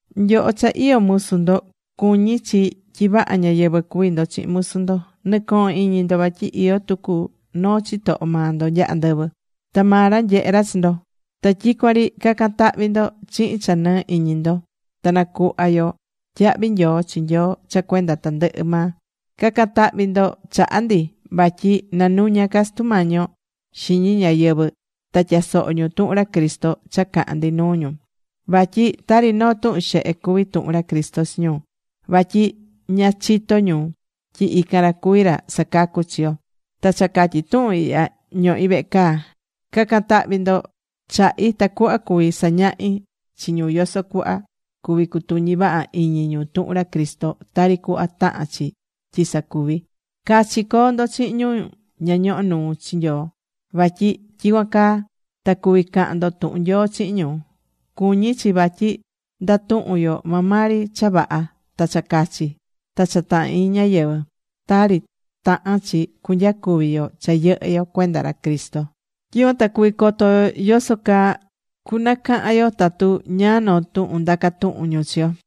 Nyoho cha iyó musu ndo, cuñí chi tyi vaha ñáyɨvɨ cuví ndo chihin musu ndo. Nɨ̱cohon iñi ndo vatyi iyó tucu noo chitoho maa ndo nya andɨvɨ. Ta maa ra nyehé ra chi ndo. Ta tyicuan ri ca̱can tahvi ndo chihin cha nɨɨ́ iñi ndo. Ta nacuhva yo tyahvi nyoo chi Nyoo cha cuenda tandɨhɨ maa. Ca̱can tahvi ndo chaha ndi, vatyi nanuña ca Sutu Mañi yo xiñi ñáyɨvɨ ta tyasoho ñu tuhun ra Cristo cha cahán ndi nuu ñu. Vatyi tari noo tuhun xehe cuví tuhun ra Cristo chi ñu, vatyi ña chitó ñu tyi ican ra cuví ra sacacú chi yo. Ta cha catyi tuhun ihya ñohí vehe caa. Ca̱can tahvi ndo chahi tacuhva cuví sañahí chi ñu yoso cuhva cuvi cutuñi vaha iñi ñu tuhun ra Cristo, tari cuhva tahán chi tyi sacuví. Cachi co̱o ndo chihin ñu ña ñohó nuu chi Nyoo. Vatyi tyicuan caa ta cuvi cahan ndo tuhun Nyoo chihin ñu. Cuñí chi vatyi ndatuhún yo maa maa ri cha vaha, ta cha cachi, (ta cha tahán iñi ñáyɨvɨ) tari tahán chi cunyacuvi yo cha yɨhɨ́ yo cuenda ra Cristo. Tyicuan ta cuvi coto yo yoso caa cunacahan yo tatu ñáá noo tuhun ndacá tuhun ñu chi yo.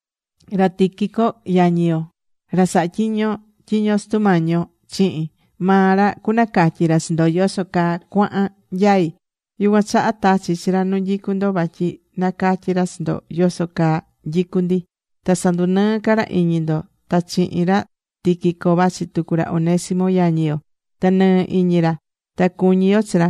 Ra Tíquico, yañi yo, ra sahá tyiño tyiño Sutu Mañi yo chihin, maa ra cunacatyi ra chi ndo yoso caa cuahán nyaí. Yucuan chaha tachí chi ra nu nyicu ndo vatyi nacatyí ra chi ndo yoso caa nyicú ndi. Ta sandunɨɨ ca ra iñi ndo. Ta chihin ra Tíquico vachi tucu ra Onésimo, yañi yo. Ta nɨɨ iñi ra. Ta cuñí yo chi ra.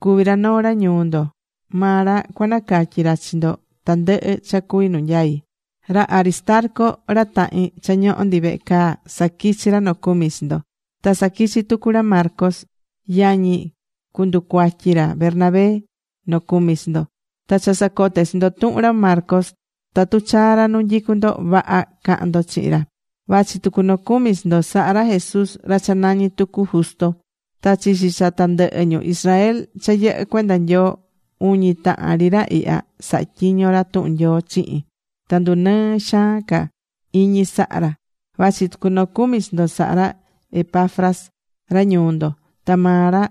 Cuví ra noo ra ñuu ndo. Maa ra cucanacatyi ra chi ndo tandɨhɨ cha cuví nu nyai. Ra Aristarco, ra tahin cha ñohó ndi vehe caa, saquichí ra nocumi chi ndo. Ta saquichí tucu ra Marcos, yañi cunducuatyi ra Bernabé, nocumi chi ndo. Ta cha sacote̱ chi ndo tuhun ra Marcos. Tatu chaa ra nu nyicu ndo, vaha ca̱han ndo chihin ra. Vachi tucu nocumi chi ndo sahá ra Jesús, ra cha nañi tucu Justo. Ta chichi cha tandɨhɨ ñu Israel cha yɨhɨ́ cuenda Nyoo, uñi tahan ri ra ihya sahá tyiño ra tuhun Nyoo chihin. Ta ndunɨɨ xaan ca iñi sahá ra. Vachi tucu nocumi chi ndo sahá ra Epafras, ra ñuu ndo. Ta maa ra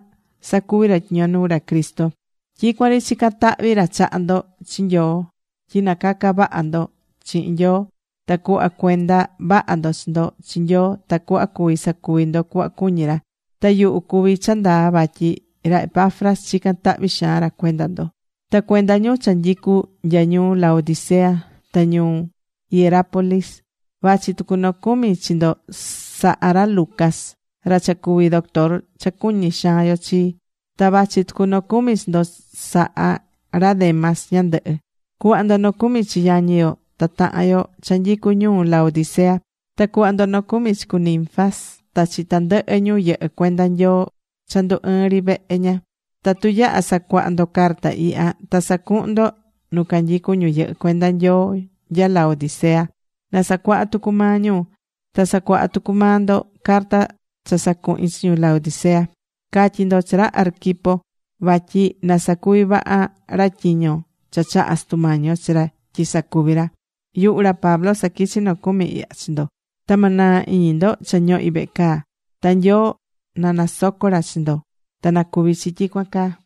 sacuví ra tyiño nuu ra Cristo. Tyicuan ri chicán tahvi ra chaha ndo chi Nyoo tyi nacaca vaha ndo chihin Nyoo. Na̱cuhva cuenda vaha ndo chi ndo chi Nyoo tacuhva cuvi sacuvi ndo cuhva cuñí ra. Ta yuhu cuví cha ndaa vatyi ra Epafras chicán tahvi xaan ra cuenda ndo, ta cuenda ñu cha nyicu nya ñuu Laodicea ta ñuu Hierápolis. Vachi tucu nocumi chi ndo sahá ra Lucas, ra cha cuví doctor cha cuñí xaan yo chi. Ta vachi tucu nocumi chi ndo sahá ra Demas ñandɨhɨ. Cu̱hva ndo nocumi chi yañi yo ta tahan yo cha nyicu ñuu Laodicea. Ta cu̱hva ndo nocumi chi cu Ninfas ta chi tandɨhɨ ñu yɨhɨ́ cuenda Nyoo cha ndu ɨɨ́n ri vehe ña. Tatu yaha sacuaha ndo carta ihya, ta sa̱cuhun ndo nu canyicu ñu yɨhɨ́ cuenda Nyoo nya Laodicea na sacuaha tucu maa ñu. Ta sa̱cuaha tucu maa ndo carta cha sacuhi̱n chi ñu Laodicea. Ca̱tyi ndo chi ra Arquipo vatyi na sacuvi vaha ra tyiño cha chahá Sutu Mañi yo chi ra tyi sacuví ra. Yuhu ra Pablo saquichí nocumi ihya chi ndo. Ta ma naa iñi ndo cha ñohí vehe caa. Ta Nyoo na nasoco ra chi ndo. Ta na cuvi chi tyicuan caa.